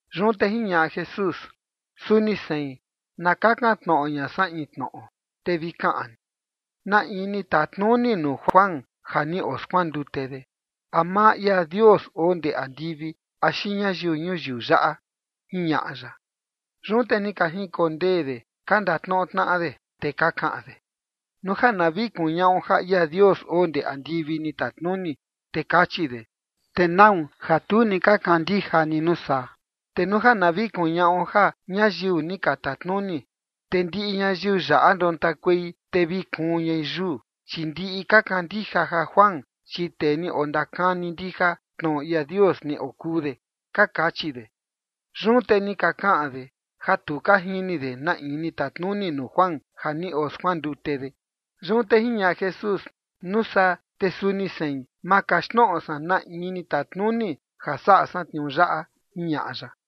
Yun te jiñaꞌa Jesús: ―Suni sein na kakan tnoꞌo ña san in tnoꞌo, te vi kaꞌan ni. ¿Na in ni tatnuni nuu Juan ja ni oskuandute de? ¿A maa ia Dios oo ndee andivi axi ñayiu ñuyiu yaꞌa? ―jiñaꞌa ya. Yun te ni ka jinkondee de ka ndatnoꞌo tnaꞌa de, te ka kaꞌan de: ―Nuu ja na vi kuñaꞌo ja ia Dios oo ndee andivi ni tatnuni, te kachi de: “¿Te nau ja tu ni ka kandija ni nuu saa?” Te nuu na vi kuñaꞌo ja ñayiu ni ka tatnuni, te ndiꞌi ñayiu yaꞌa ndontakuei, te vi kuun ñai yuu, chi ndiꞌi ka kandija ja Juan, chi tee ni ondakani ndija tnoꞌo ia Dios ni okuu de ―ka kachi de. Yun te ni ka kaꞌan de ja tu ka jini de na in ni tatnuni nuu Juan ja ni oskuandute de. Yun te jiñaꞌa Jesús: ―Nuu saa te suni sein, ma kaxtnoꞌo san na in ni tatnuni ja saꞌa san tniuu yaꞌa ―jiñaꞌa ya.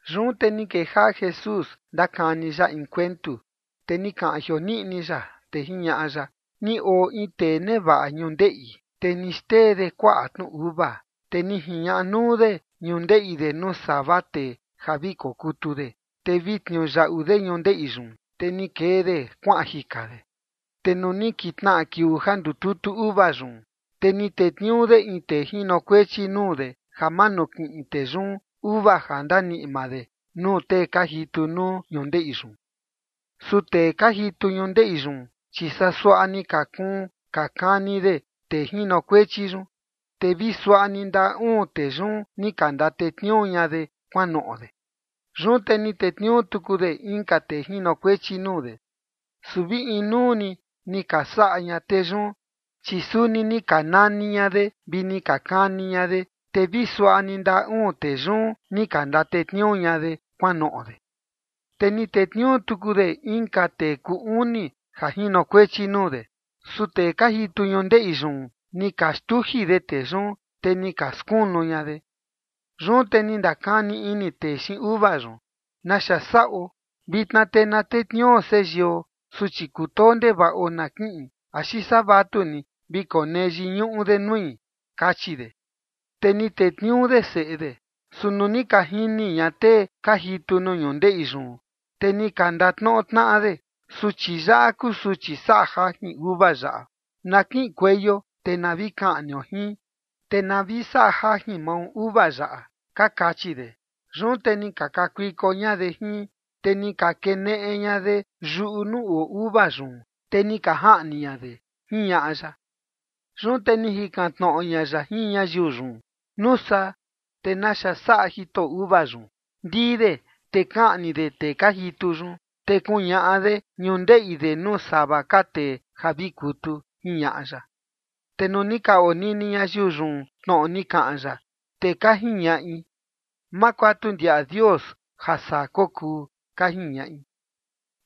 Yun te ni kejaꞌa Jesús ndakani ya in kuentu, te ni kaꞌan jioniꞌni ya, te jiñaꞌa ya: ―Ni oo in tee nevaꞌa ñundeꞌi, te ni xtee de kuaꞌa tnu uva. Te ni jiñaꞌa nuu de ñundeꞌi de nuu sava tee ja vi kokutu de, te vi tniuyaꞌu de ñundeꞌi yun, te ni kee de kuaꞌan jika de. Te nuu ni kintnaꞌa kiuu ja ndututu uva yun, te ni tetniuu de in tee jinokuechi nuu de ja manukiꞌin tee yun uva ja ndaniꞌi maa de nuu tee ka jitu nuu ñundeꞌi yun. Su tee ka jitu ñundeꞌi yun, chi saa suaꞌa ni ka kuun ka kani de tee jinokuechi yun, te vi suaꞌa ni ndaꞌa uun tee yun ni ka ndatetniuu ña de kuanoꞌo de. Yun te ni tetniuu tuku de inka tee jinokuechi nuu de. Su vi inuu ni ni ka saꞌa ña tee yun, chi suni ni ka nani ña de, vi ni ka kani ña de, te vi suaꞌa ni ndaꞌa uun tee yun, ni ka ndatetniuu ña de kuanoꞌo de. Te ni tetniuu tuku de inka tee kuu uni ja jinokuechi nuu de. Su tee ka jitu ñundeꞌi yun ni ka xtuji de tee yun, te ni ka skunu ña de. ’Yun te ni ndakani ini tee xiin uva yun: “¿Naxa saꞌo? Vitna te na tetniuu seyio, suchi kutoo ndevaꞌo, na kiꞌin, axi saa vatuni vi konee yiñuꞌu de nui”, kachi de. Te ni tetniuu de seꞌe de. Su nuu ni ka jini ña tee ka jitu nuu ñundeꞌi yun, te ni ka ndatnoꞌo tnaꞌa de: “Suchi yaꞌa kuu suchi saꞌa jajin uva yaꞌa. Na kiꞌinkueio te na vi kaꞌnio jin, te na vi saꞌa jajin mao uva yaꞌa”, ka kachi de. Yun te ni ka kakuiko ña de jin, te ni ka keneꞌe ña de yuꞌu nuu oo uva yun, te ni ka jaꞌni ña de ―jiñaꞌa ya. Yun te ni jikan tnoꞌo ña ya jin ñayiu yun: ―Nuu saa, te ¿naxa saꞌa jitoꞌo uva yun? Ndii de te kaꞌni de tee ka jitu yun, te kuñaꞌa de ñundeꞌi de nuu sava ka tee ja vi kutu ―jiñaꞌa ya. Te nuu ni ka onini ñayiu yun tnoꞌo ni kaꞌan ya, te ka jiñaꞌi: ―¡Ma kuatu ndiaꞌa Dios ja saa kokuu! ―ka jiñaꞌi.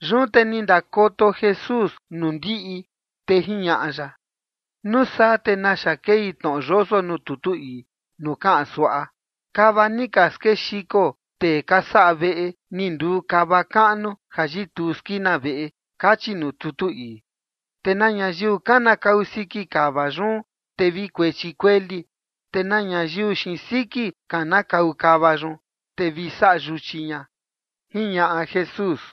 Yun te ni ndakoto Jesús nuu ndiꞌi, te jiñaꞌa ya: ―Nuu saa te naxa kei tnoꞌo yoso nuu tutu ii nuu kaꞌan suaꞌa: Kava ni ka skexiko tee ka saꞌa veꞌe, ni nduu kava kaꞌnu ja yituu skina veꞌe kachi nuu tutu ii. ’Te na ñayiu kanakau siki kava yun, te vi kuechi kueli. Te na ñayiu xiin siki kanakau kava yun, te vi saꞌa yuchi ña ―jiñaꞌa Jesús.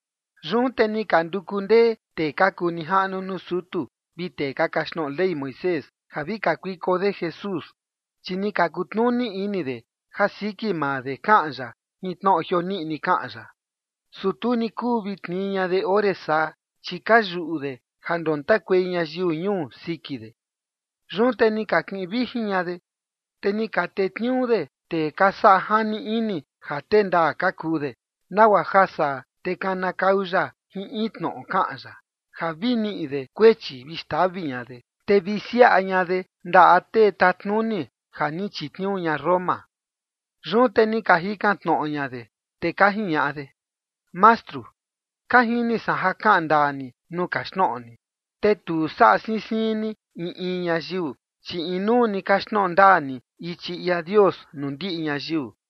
Yun te ni ka nduku ndee tee ka kuu nijaꞌnu nuu sutu vi tee ka kaxtnoꞌo Ley Moisés, ja vi kakuiko de Jesús, chi ni ka kutnuni ini de ja siki maa de kaꞌan ya jin tnoꞌo jioniꞌni kaꞌan ya. Su tu ni kuu vi tnii ña de ore saa, chi ka yuꞌu de ja ndontakuei ñayiu ñuu siki de. Yun te ni ka kiꞌin vijin ña de, te ni ka tetniuu de tee ka saꞌa jani ini ja tee ndaa ka kuu de, nagua ja saa, te kanakau ya jin in tnoꞌo kaꞌan ya, ja vi niꞌi de kuechi vi xtavi ña de, te vi siaꞌa ña de ndaꞌa tee tatnuni ja ni chitniuu ña Roma. Yun te ni ka jikan tnoꞌo ña de, te ka jiñaꞌa de: ―Mastru, ka jini san ja kaꞌan ndaa ni nuu kaxtnoꞌo ni, te tu saꞌa siin siin ni in in ñayiu, chi inuu ni kaxtnoꞌo ndaa ni ichi ia Dios nuu ndiꞌi ñayiu.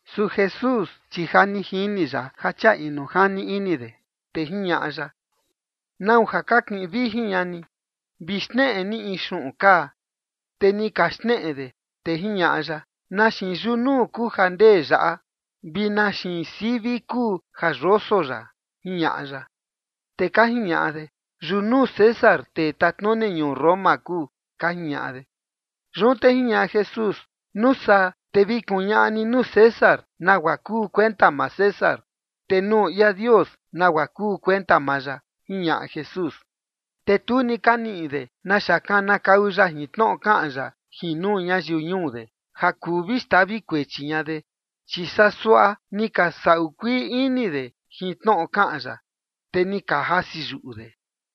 Su Jesús, chi ja ni jini ya ja chia inu jani ini de, te jiñaꞌa ya: ―¿Nau ja ka kiꞌin vijin ña ni? Vi xneꞌe ni in xuꞌun kaa. Te ni ka xneꞌe de. Te jiñaꞌa ya: ―¿Na xiin yunuu kuu ja ndee yaꞌa, vi na xiin sivi kuu ja yoso yaꞌa? ―jiñaꞌa ya. Te ka jiñaꞌa de: ―Yunuu César, tee tatnuni ñuu Roma kuu ―ka jiñaꞌa de. Yun te jiñaꞌa Jesús: ―Nuu saa te vi kuñaꞌa ni nuu César nagua kuu kuenta maa César, te nuu ia Dios nagua kuu kuenta maa ya ―jiñaꞌa Jesús. Te tu ni ka niꞌi de naxa kanakau ya jin tnoꞌo kaꞌan ya jin nuu ñayiu ñuu de, ja kuu vi xtavi kuechi ña de. Chi saa suaꞌa ni ka saꞌu kuii ini de jin tnoꞌo kaꞌan ya, te ni ka jasi yuꞌu de.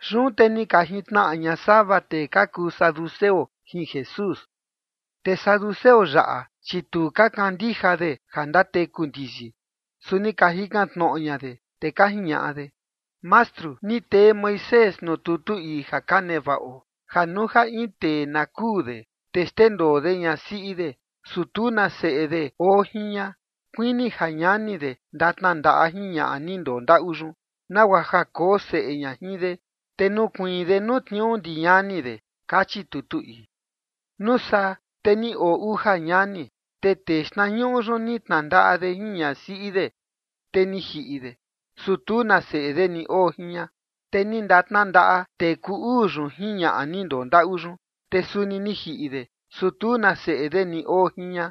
Yun te ni ka jintnaꞌa ña sava tee ka kuu saduceo jin Jesús. Te saduceo yaꞌa, chi tu ka kandija de ja ndateku ndiyi, su ni ka jikan tnoꞌo ña de, te ka jiñaꞌa de: ―Mastru, ni tee Moisés nuu tutu ii ja ka nevaꞌo ja nuu ja in tee na kuu de, te xndendoo de ñasiꞌi de, su tu na seꞌe de oo jin ña, kuini ja ñani de ndatnandaꞌa jin ñaꞌa ni ndondaꞌu yun, nagua ja koo seꞌe ña jin de, te nukuiin de nuu tniuu ndi ñani de, kachi tutu ii. Nuu saa, te ni oo uja ñani. Te tee xtnañuꞌu yun ni tnandaꞌa de jin ñasiꞌi de, te ni jiꞌi de, su tu na seꞌe de ni oo jin ña. Te ni ndatnandaꞌa tee kuu uu yun jin ñaꞌa ni ndondaꞌu yun. Te suni ni jiꞌi de, su tu na seꞌe de ni oo jin ña.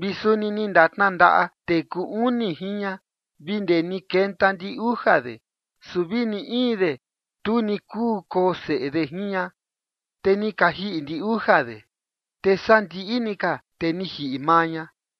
Vi suni ni ndatnandaꞌa tee kuu uni jin ña, vi ndee ni kenta ndi uja de. Su vi ni in de, tu ni kuu koo seꞌe de jin ña. Te ni ka jiꞌi ndi uja de. Te sandiꞌi ni ka, te ni jiꞌi maa ña.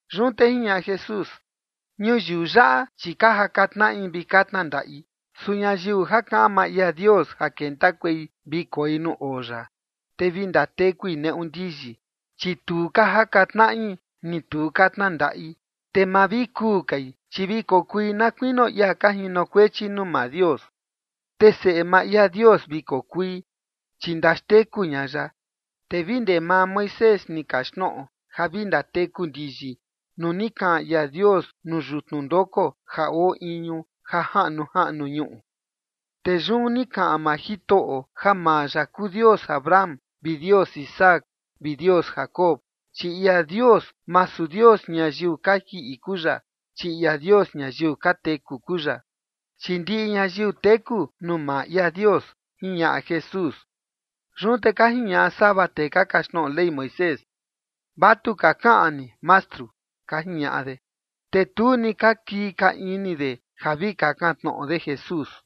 Yun te jiñaꞌa Jesús: ―Ñuyiu yaꞌa, chi ka jaka tnaꞌi vi ka tnandaꞌi. Su ñayiu ja kaꞌan maa ia Dios ja kentakuei vi koi nuu oo ya, te vi ndatekui neꞌu ndiyi, chi tu ka jaka tnaꞌi ni tu ka tnandaꞌi. Te ma vi kuu kai, chi vi kokui na kuinio ia ka jinokuechi nuu maa Dios. Te seꞌe maa ia Dios vi kokui, chi ndaxteku ña ya. Te vi ndee maa Moisés ni kaxtnoꞌo ja vi ndateku ndiyi nuu ni kaꞌan ia Dios nuu yutnu ndoko ja oo iñu ja jaꞌnu jaꞌnu ñuꞌu. Te yun ni kaꞌan maa Jitoꞌo, ja maa ya kuu Dios Abraham vi Dios Isaac vi Dios Jacob. Chi ia Dios, masu Dios ñayiu ka jiꞌi kuu ya, chi ia Dios ñayiu ka teku kuu ya. Chi ndiꞌi ñayiu teku nuu maa ia Dios ―jiñaꞌa Jesús. Yun te ka jiñaꞌa sava tee ka kaxtnoꞌo Ley Moisés: ―Vatuka kaꞌan ni, Mastru ―ka jiñaꞌa de. Te tu ni ka kii ka ini de ja vi kakan tnoꞌo de Jesús.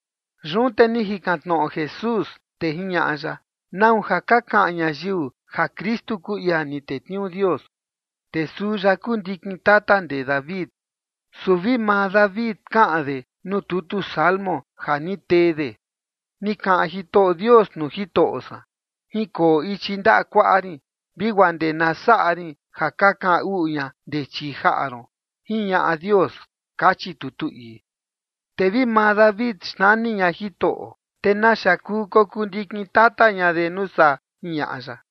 Yun te ni jikan tnoꞌo Jesús, te jiñaꞌa ya: ―¿Nau ja ka kaꞌan ñayiu ja Kristu kuu ia ni tetniuu Dios, te suu ya kuu ndikin tata ndee David? Su vi maa David kaꞌan de nuu tutu Salmo ja ni tee de: Ni kaꞌan Jitoꞌo Dios nuu Jitoꞌo san: “Jinkoo ichi ndaꞌa kuaꞌa rin vi guaa ndee na saꞌa rin ja ka kaꞌan uꞌu ña ndee chii jaꞌa ron” jiñaꞌa Dios, kachi tutu ii. Te vi maa David xnani ña Jitoꞌo, te ¿naxa kuu kokuu ndikin tata ña de nuu saa? ―jiñaꞌa ya.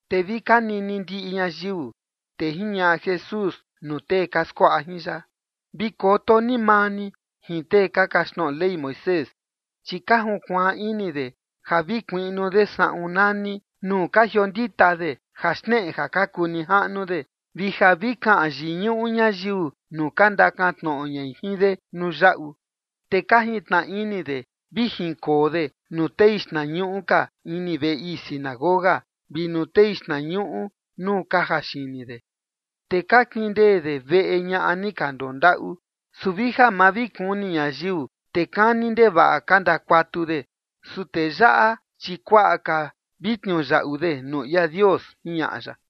Te vi ka nini ndiꞌi ñayiu, te jiñaꞌa Jesús nuu tee ka skuaꞌa jin ya: ―Vi koto ni maa ni jin tee ka kaxtnoꞌo Ley Moisés, chi ka junkuaan ini de ja vi kuiꞌnu de saꞌun nani nuu ka jiondita de, ja xneꞌe ja ka kuu nijaꞌnu de, vi ja vi kaꞌan yiñuꞌu ñayiu nuu ka ndakantnoꞌo ñai jin de nuu yaꞌu. Te ka jintnaꞌa ini de vi jinkoo de nuu tei xtnañuꞌu ka ini veꞌe ii sinagoga, vi nuu tei xtnañuꞌu nuu ka jaxini de. Te ka kindee de veꞌe ñaꞌa ni ka ndondaꞌu, su vi ja ma vi kuni ñayiu, te kani ndevaꞌa ka ndakuatu de. Su tee yaꞌa, chi kuaꞌa ka vi tniuyaꞌu de nuu ia Dios ―jiñaꞌa ya.